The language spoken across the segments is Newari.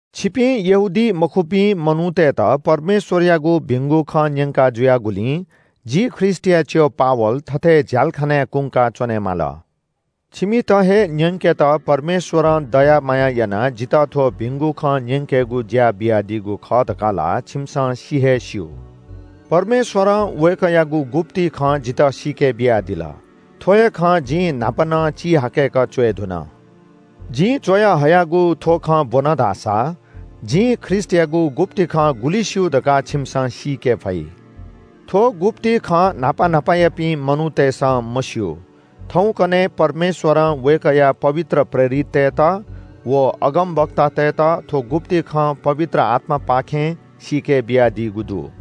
छिपिं यहूदीमखुपिं मनूतय्‌त परमेश्‍वरयागु भिंगु खँ न्‍यंका जुयागुलिं जि ख्रीष्‍टया च्‍यः पावल थथे झ्‍यालखानाय् कुंका च्‍वनेमाल। छिमित हे न्‍यंकेत परमेश्‍वरं दया माया यानाः जितः थ्‍व भिंगु खँ न्‍यंकेगु ज्‍या बियादीगु खः धकाः ला छिमिसं सि हे स्‍यू। परमेश्‍वरं वय्‌कःयागु गुप्‍ति खँ जितः सीके बियादिल। थ्‍व हे खँ जिं न्‍हापा नं चिहाकय्‌क च्‍वये धुन। जिं च्‍वयाहयागु थ्‍व खँ ब्‍वन धाःसा जिं ख्रीष्‍टयागु गुप्‍ति खँ गुलि स्‍यू धकाः छिमिसं सीके फइ। थ्‍व गुप्‍ति खँ न्‍हापा न्‍हापायापिं मनूतय्‌सं मस्‍यू। थौंकन्‍हय् परमेश्‍वरं वय्‌कःया पवित्र प्रेरिततय्‌त व अगमवक्तातय्‌त थ्‍व गुप्‍ति खँ पवित्र आत्‍मापाखें सीके बियादीगु दु।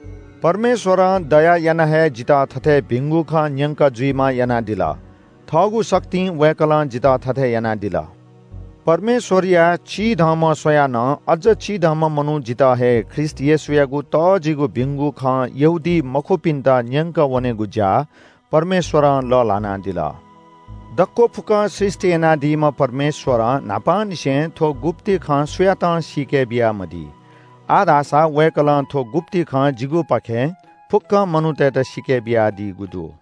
परमेश्‍वरं दया यानाः हे जितः थथे भिंगु खँ न्‍यकं जुइम्‍ह यानादिल। थःगु शक्तिं वय्‌कलं जितः थथे यानादिल। परमेश्‍वरया चिधंम्‍ह स्‍वयाः नं अज्‍ज चिधंम्‍ह मनू जितः हे ख्रीष्‍टयागु तःजिगु भिंगु खँ यहूदीमखुपिन्‍त न्‍यंकः वनेगु ज्‍या परमेश्‍वरं लःल्‍हानादिल। दक्‍व फुक्‍कं सृष्‍टि यानादीम्‍ह परमेश्‍वरं न्‍हापांनिसें थ्‍व गुप्‍ति खँ सुयातं सीके बियामदी। आः धाःसा वय्‌कलं थ्‍व गुप्‍ति खँ जिगुपाखें फुक्‍क मनूतय्‌त सीके बियादीगु दु।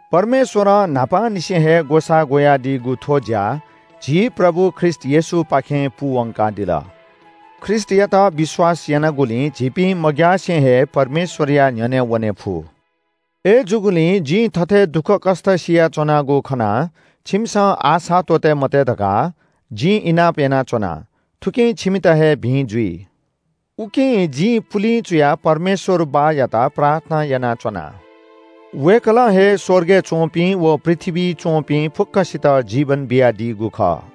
परमेश्‍वरं न्‍हापांनिसें हे ग्‍वसाः ग्‍वयादीगु थ्‍व ज्‍या झी प्रभु ख्रीष्‍ट येशूपाखें पूवंकादिल। ख्रीष्‍टयात विश्‍वास यानागुलिं झीपिं मग्‍यासे हे परमेश्‍वरया न्‍ह्यःने वने फु। अय्‌जूगुलिं जिं थथे दुःखकष्‍ट सियाच्‍वनागु खनाः छिमिसं आशा त्‍वःते मते धकाः जिं इनाप यानाच्‍वना। थुकिं छिमित हे भिं जुइ। उकिं जिं पुलिं चुयाः परमेश्‍वर बाःयात प्रार्थना यानाच्‍वना। वय्‌कलं हे स्‍वर्गय् च्‍वंपिं व पृथ्‍वीइ च्‍वंपिं फुक्‍कसित जीवन बियादीगु खः।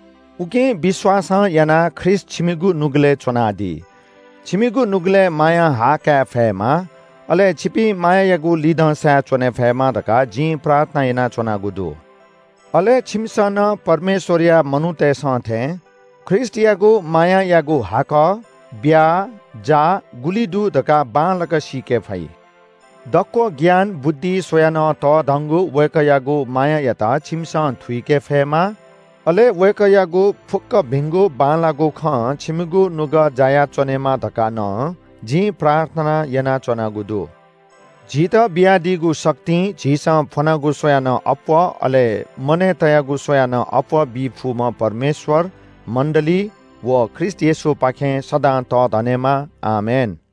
उकिं विश्‍वासं यानाः ख्रीष्‍ट छिमिगु नुगलय् च्‍वनादी। छिमिगु नुगलय् मायां हा काय् फयेमा, अले छिपिं मायायागु लिधंसाय् च्‍वने फयेमा धकाः जिं प्रार्थना यानाच्‍वनागु दु। अले छिमिसं नं परमेश्‍वरया मनूतय्‌सं थें ख्रीष्‍टयागु मायायागु हाकः, ब्‍या, जाः गुलि दु धकाः बांलाक सीके फइ। दक्‍व ज्ञान बुद्धि स्‍वयाः नं तःधंगु वय्‌कःयागु मायायात छिमिसं थुइके फयेमा, अले वय्‌कःयागु फुक्‍क भिंगु बांलाःगु खं छिमिगु नुगः जायाच्‍वनेमा धकाः नं जिं प्रार्थना यानाच्‍वनागु दु। झीत बियादीगु शक्तिं झीसं फ्‍वनागु स्‍वयाः नं अप्‍वः अले मनय् तयागु स्‍वयाः नं अप्‍वः बी फुम्‍ह परमेश्‍वर मण्‍डली व ख्रीष्‍ट येशूपाखें सदां तःधनेमा। आमेन।